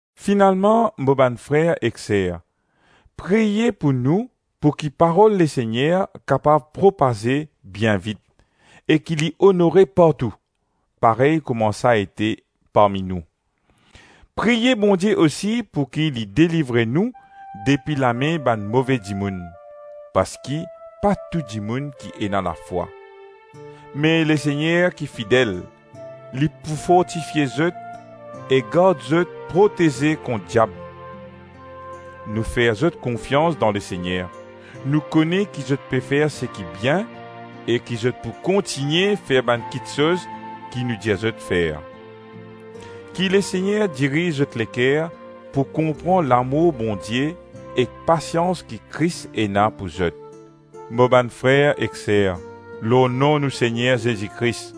Finalman, mo bann frer ek ser, priye pou nou pouki Parol Lesegner kapav propaze bien vit e ki li onore partou, parey kouma sa ete parmi nou. Priye Bondie osi pouki li delivre nou depi lame bann move dimoun; parski pa tou dimoun ki ena lafwa. Me Lesegner ki fidel, li pou fortifie zot e gard zot proteze kont diab. Nou fer zot konfians dan Lesegner; nou kone ki zot pe fer seki bien e ki zot pou kontigne fer bann kitsoz ki nou dir zot fer. Ki Lesegner diriz zot leker pou konpran lamour Bondie ek pasians ki Kris ena pou zot. Mo bann frer ek ser, lor nom nou Segner Zezi Kris,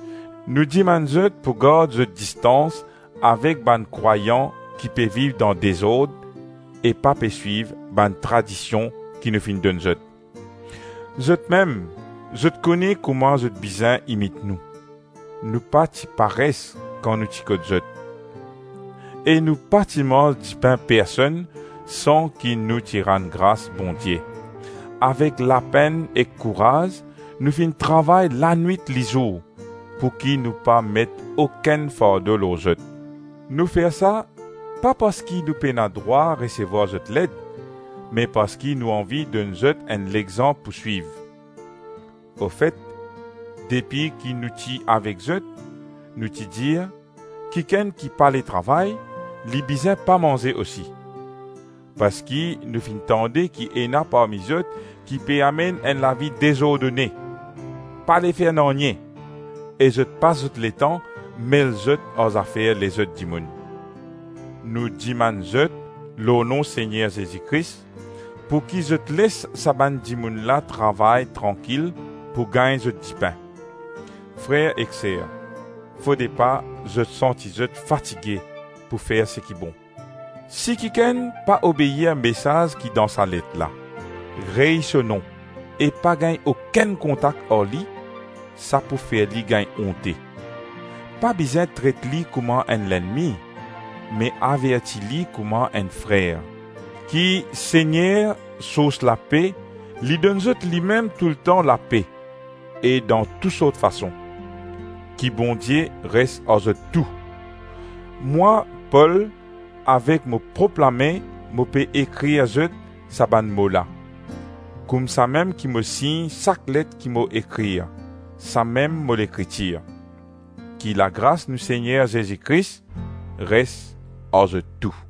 nou dimann zot pou gard zot distans avek bann krwayan ki pe viv dan dezord e pa pe swiv bann tradision ki nou finn donn zot. Zotmem, zot kone kouma zot bizin imit nou; nou pa ti pares kan nou ti kot zot, e nou pa ti manz dipin personn san ki nou ti rann gras Bondie. Avek lapenn ek kouraz nou finn travay lanwit-lizour, pouki nou pa met okenn fardo lor zot. Nou fer sa, pa parski nou pena drwa resevwar zot led, me parski nou anvi donn zot enn lexanp pou swiv. Ofet depi ki nou ti avek zot, nou ti dir, “Kikenn ki pale travay, li bizin pa manze osi.” Parski nou finn tande ki ena parmi zot ki pe amenn enn lavi dezordone, pale fer nanye e zot pas zot letan mel zot ar zafer lezot dimoun. Nou dimann zot lor nom Segner Zezi Kris, pouki zot les sa bann dimoun la travay trankil pou gagn zot dipin. Frer ek ser, fode pa zot santi zot fatige pou fer seki bon. Si kikenn pa obeir mesaz ki dan sa let la; rey so nom e pa gagn okenn kontak ar li; sa pou fer li gagn onte. Pa bizin tret li kouma enn lennmi, me averti li kouma enn frer. Ki Segner, sours lape, li donn zot limem toultan lape e dan tou sort fason. Ki Bondie res ar zot tou. Mwa, Pol, avek mo prop lame, mo pe ekrir zot sa bann mo la. Koumsamem ki mo sign sak let ki mo ekrir, samem mo lekritir. Ki lagras nou Segner Zezi Kris res ar zot tou.